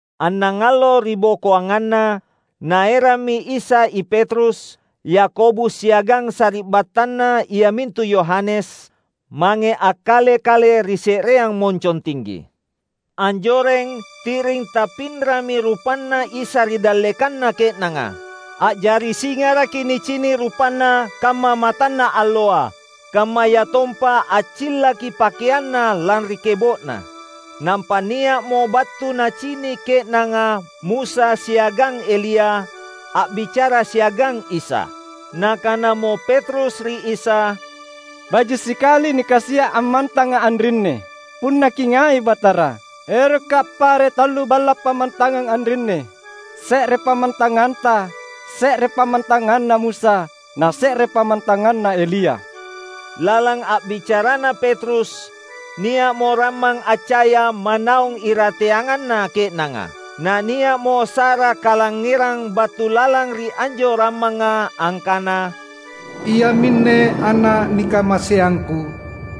Annangallo ribokoanganna, Naerammi Isa i Petrus, Yakobus siagang sari’battanna iamintu Yohanes, mange akkale-kale ri se’reang moncong tinggi. Anjoreng, ti’ring tappinrami rupanNa Isa ri dallekanna ke’nanga: a’jari singaraki nicini’ rupanNa kamma matanna alloa. Kammayatompa accillaki pakeanNa lanri kebo’na. Nampa nia’mo battu nacini’ ke’nanga Musa siagang Elia, a’bicara siagang Isa. Nakanamo Petrus ri Isa, "Baji’ sikali nikasia’ ammantanga anrinni. Punna Kingai, Batara, erokka’ appare’ tallu balla’ pammantangang anrinni: se’re pammantanganTa, se’re pammantanganna Musa, na se’re pammantanganna Elia." Lalang a’bicarana Petrus, nia’mo rammang accaya manaung irateanganna ke’nanga. Nania’mo sa’ra kalangngerang battu lalang ri anjo rammanga angkana, "Iaminne Ana’ nikamaseangKu.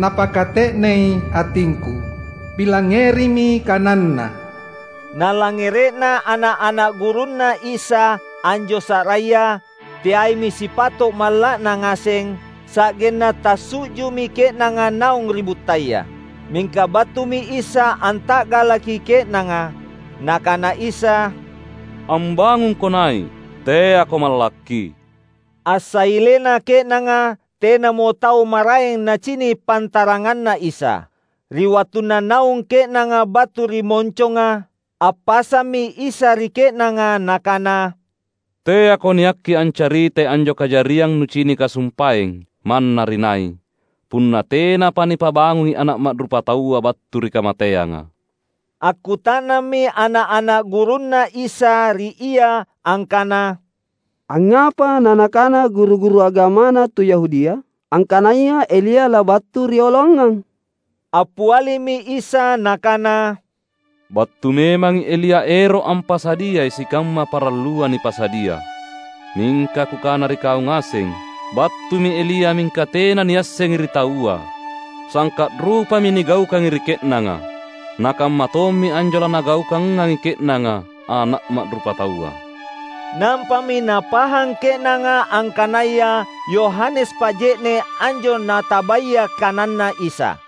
Napakate’nei atingKu. Pilangngerimi kananNa!" Nalangngere’na ana’-ana’ gurunNa Isa anjo sa’raya, teaimi sipato’ malla’na ngaseng, sa’genna tassu’ju’mi ke’nanga naung ri buttaya. Mingka battumi Isa anta’galaki ke’nanga. Nakana Isa, "Ambangungko nai’, teako mallakki!" Assailena ke’nanga, tenamo tau maraeng nacini’ pantaranganna Isa. Ri wattunna naung ke’nanga battu ri monconga, appasammi Isa ri ke’nanga Nakana, "Teako niakki ancaritai anjo kajariang nucinika sumpaeng manna ri nai, punna tenapa nipabangungi Ana’ Ma’rupataua battu ri kamateanga." Akkuta’nammi ana’-ana’ gurunNa Isa ri Ia angkana, "Angngapa nanakana guru-guru agamana tu Yahudia, angkanaya Elia labattu rioloangang?" Appialimi Isa Nakana, "Battu memangi Elia ero’ ampasadiai sikamma parallua nipasadia. Mingka Kukana ri kau ngaseng, battumi Elia mingka tena niassengi ri taua. Sangka’ rupami nigaukangi ri ke’nanga. Na kammatommi anjo lanagaukangangi ke’nanga Ana’ Ma’rupataua." Nampami napahang ke’nanga angkanaya Yohanes Paje’ne’ anjo natabaya kananNa Isa.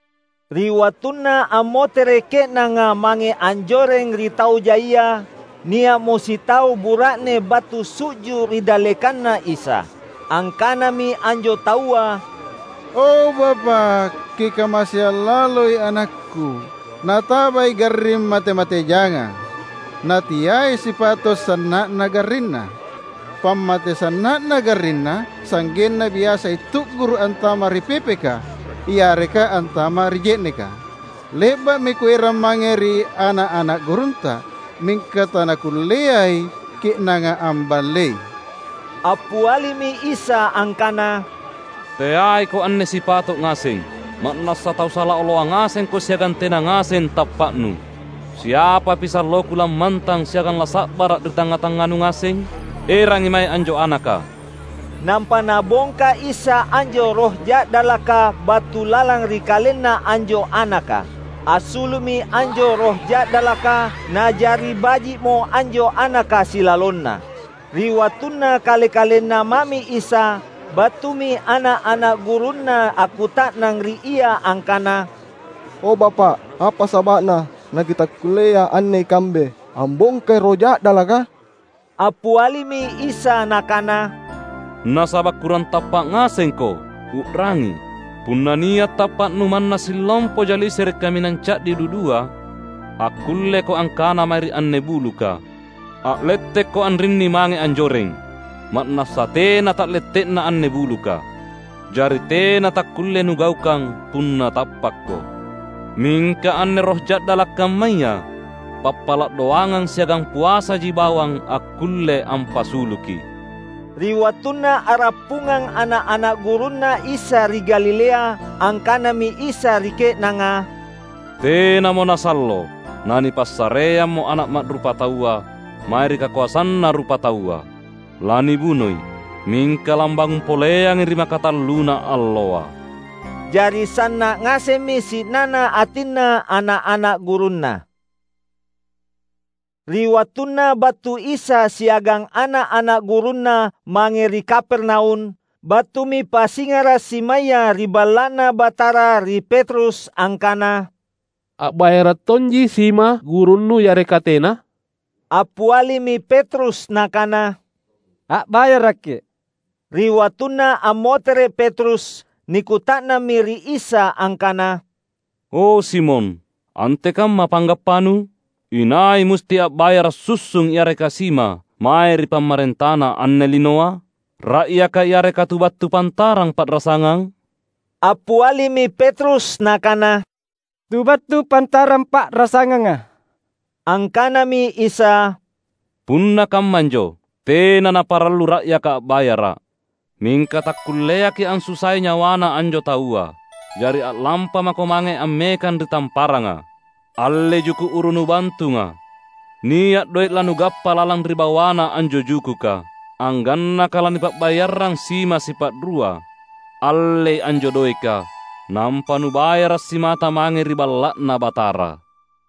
Ri wattunna ammotere’ ke’nanga mange anjoreng ri tau jaia, nia’mo sitau bura’ne battu su’ju’ ri dallekanNa Isa. Angkanami anjo taua, "O Bapa’, Kikamaseang laloi anakku. Natabai garring mate-mate jangang. Nateai sipato’ sanna’na garrinna. Pammate sanna’na garrinna sa’genna biasai tu’guru’ antama’ ri pepeka yareka antama’ ri je’neka. Le’ba’mi kuerang mange ri ana’-ana’ gurunTa, mingka tanakulleai ke’nanga amballei." Appialimi Isa angkana, "Teaiko anne sipato’ ngaseng! Ma’nassa tau sala oloang ngasengko siagang tena ngaseng tappa’nu. Siapapi salloKu lammantang siagang lasa’bara’ ri tangnga-tangnganu ngaseng? Erangi mae anjo anaka!" Nampa Nabongka Isa anjo roh ja’dalaka battu lalang ri kalenna anjo anaka. Assulu’mi anjo roh ja’dalaka, na’jari baji’mo anjo anaka silalonna. Ri wattunna kale-kalenna mami Isa, battumi ana’-ana’ gurunNa akkuta’nang ri Ia angkana, "O Bapa’, apa saba’na nakitakkullea anne ikambe ambongkai roh ja’dalaka?" Appialimi Isa Nakana, "Nasaba’ kurang tappa’ ngasengko. U’rangi! Punna nia’ tappa’nu manna sillompoja lisere’ kaminang ca’di dudua, akkulleko angkana mae ri anne buluka, ‘A’lettekko anrinni mange anjoreng!’ ma’nassa tena ta’lette’na anne buluka. Jari tena takkulle nugaukang punna tappakko! [Mingka anne roh ja'dala' kammaya pappala' doangang siagang puasaji bawang akkulle ampasuluki.]" Ri wattunna a’rappungang ana’-ana’ gurunNa Isa ri Galilea, angkanami Isa ri ke’nanga, "Tenamo nasallo nanipassareammo Ana’ Ma’rupataua mae ri kakoasanna rupataua. Lanibunoi, mingka lambangung poleangi ri makatalluna alloa." Jari sanna’ ngasemmi si’nana atinna ana’-ana’ gurunNa. Ri wattunna battu Isa siagang ana’-ana’ gurunNa mange ri Kapernaum, battumi pasingara’ simaya ri Balla’Na Batara ri Petrus angkana, "A’bayara’ tonji sima gurunnu yareka tena?" Appialimi Petrus nakana, "A’bayaraki." Ri wattunna ammotere’ Petrus, nikuta’nammi ri Isa angkana, "O Simon, antekamma panggappanu? Inai musti a’bayara’ sussung yareka sima, mae ri pammarentana anne linoa? Ra’yaka yareka tu battu pantarang pa’rasangang?" Appialimi Petrus nakana, "Tu battu pantarang pa’rasanganga." Angkanami Isa, "Punna kammanjo, tena naparallu ra’yaka a’bayara’. Mingka takkulleaki’ ansusai nyawana anjo taua. Jari a’lampamako mange ammekang ri tamparanga. Allei juku’ uru nubantunga. Nia’ doe’ lanugappa lalang ri bawana anjo jukuka, anggannaka lanipa’bayarrang sima sipa’rua! Allei anjo doeka, nampa nubayara’ simata mange ri Balla’Na Batara!"